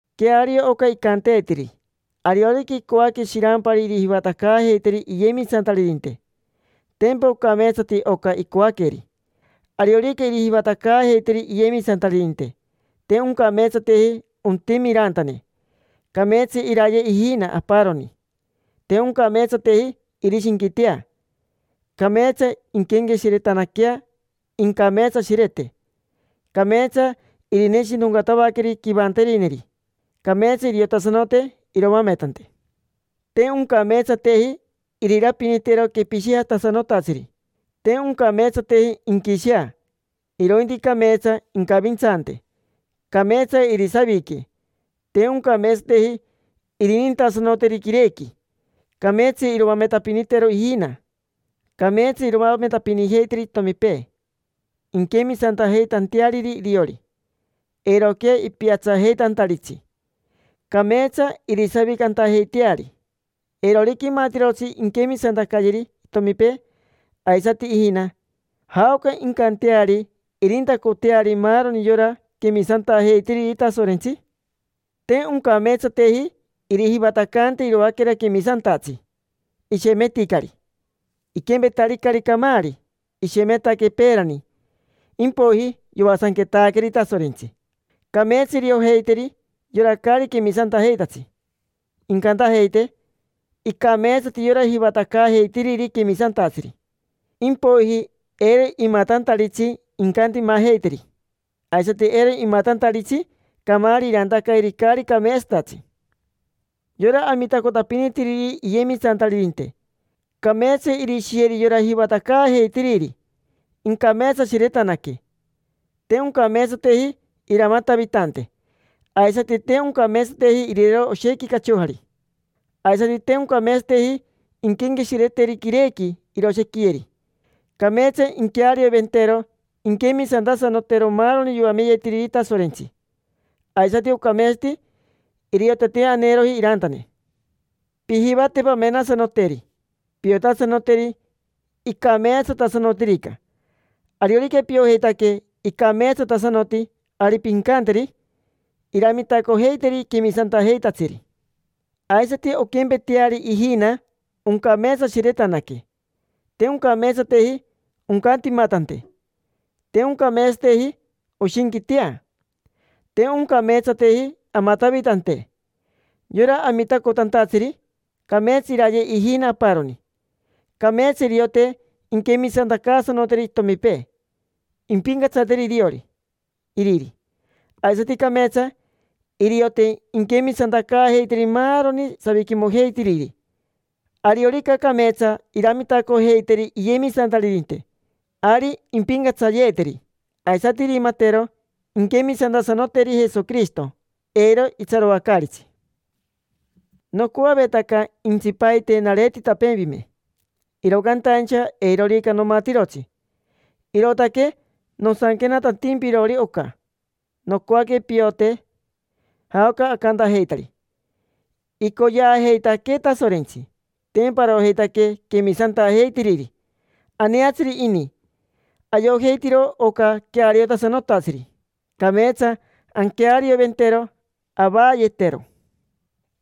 Queario oca icanteetiri: “Ariorica icoaque shirampari irijivatacaajeiteri iyemisantaririnte, tempa ocameetsati oca icoaqueri”. Ariorica irijivatacaajeiteri iyemisantaririnte, te oncameetsateji ontime irantane. Cameetsa iraye ijina aparoni, te oncameetsateji irishinquitea, cameetsa inquenqueshiretanaquea, incameetsashirete, cameetsa irineshinoncatavaqueri quivanterineri, cameetsa iriotasanote iroametante. Te oncameetsateji irirapinitero quepishijatasanotatsiri, te oncameetsateji inquishea; irointi cameetsa incavintsante, cameetsa irisavique, te oncameetsateji irinintasanoteri quirequi. Cameetsa iroametapinitero ijina, cameetsa iroametapinijeiteri itomipee, inquemisantantajeiteariri iriori, eiroquea ipiatsajeitantaritsi, cameetsa irisavicantajeiteari. Eirorica imatirotsi inquemisantacayeri itomipee, aisati ijina: ¿jaoca incanteari irintacoteari maaroni yora quemisantajeitiriri Tasorentsi? Te oncameetsateji irijivatacante iroaquera quemisantatsi: ishemeticari. Iquempetaricari camaari, ishemetaque peerani, impoiji yoasanquetaqueri Tasorentsi. Cameetsa iriojeiteri yora caari quemisantajeitatsi, incantajeite: “Icameetsati yora jivatacaajeitiriri quemisantatsiri”. Impoiji eiro imatantaritsi incantimajeiteri, aisati eiro imatantaritsi camaari irantacayeri caari cameetsatatsi. Yora amitacotapinitiriri iyemisantaririnte: cameetsa irishiyeri yora jivatacaajeitiriri, incameetsashiretanaque. Te oncameetsateji iramatavitante. Aisati te oncameetsateji irirero oshequi cachojari. Aisati te oncameetsateji inquenqueshireteri quirequi iroshequiyeri. Cameetsa inquearioventero inquemisantasanotero maaroni yoameyetiriri Tasorentsi, aisati ocameetsati iriote te aneeroji irantane. Pijivate pamenasanoteri, piotasanoteri icameetsatasanotirica. Ariorica piojeitaque icameetsatasanoti, ari pincanteri iramitacojeiteri quemisantajeitatsiri. Aisati onquempeteari ijina, oncameetsashiretanaque: te oncameetsateji oncantimatante, te oncameetsateji oshinquitea, te oncameetsateji amatavitante. Yora amitacotantatsiri, cameetsa iraye ijina aparoni. Cameetsa iriote inquemisantacaasanoteri itomipee: impincatsateri iriori iriri. Aisati cameetsa iriote inquemisantacaajeiteri maaroni saviquimojeitiriri. Ariorica cameetsa iramitacojeiteri iyemisantaririnte, ari impincatsayeeteri, aisati irimatero inquemisantasanoteri Jesoquirishito, eiro itsaroacaaritsi. Nocoavetaca intsipaite nareetitapeempime, iro cantaincha eirorica nomatirotsi. Irootaque nosanquenatantimpirori oca: nocoaque piote jaoca acantajeitari. Icoyeajeitaquee Tasorentsi: tempa arojeitaque quemisantajeitiriri. Aneatsiri ini. Ayojeitiro oca queariotasanotatsiri: cameetsa anquearioventero avaayetero.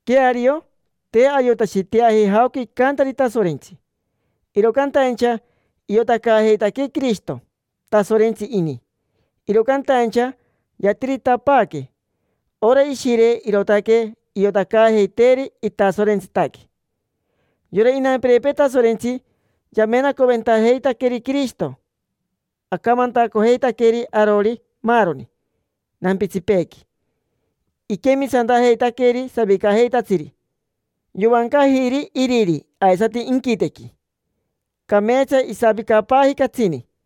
Queario, te ayotashiteaji jaoca icantari Tasorentsi, iro cantaincha iotacaajeitaquee Quirishito. Tasorentsi ini, iro cantaincha yatiritapaaque. Ora Ishire, irootaque iotacaajeiteeri itasorentsitaque. Yora inampirepee Tasorentsi yamenacoventajeitaqueri Quirishito. Acamantacojeitaqueri arori maaroni nampitsipeequi, iquemisantajeitaqueri savicajeitatsiri. Yovancajiri iriri aisati inquitequi, cameetsa isavicapaaji catsini.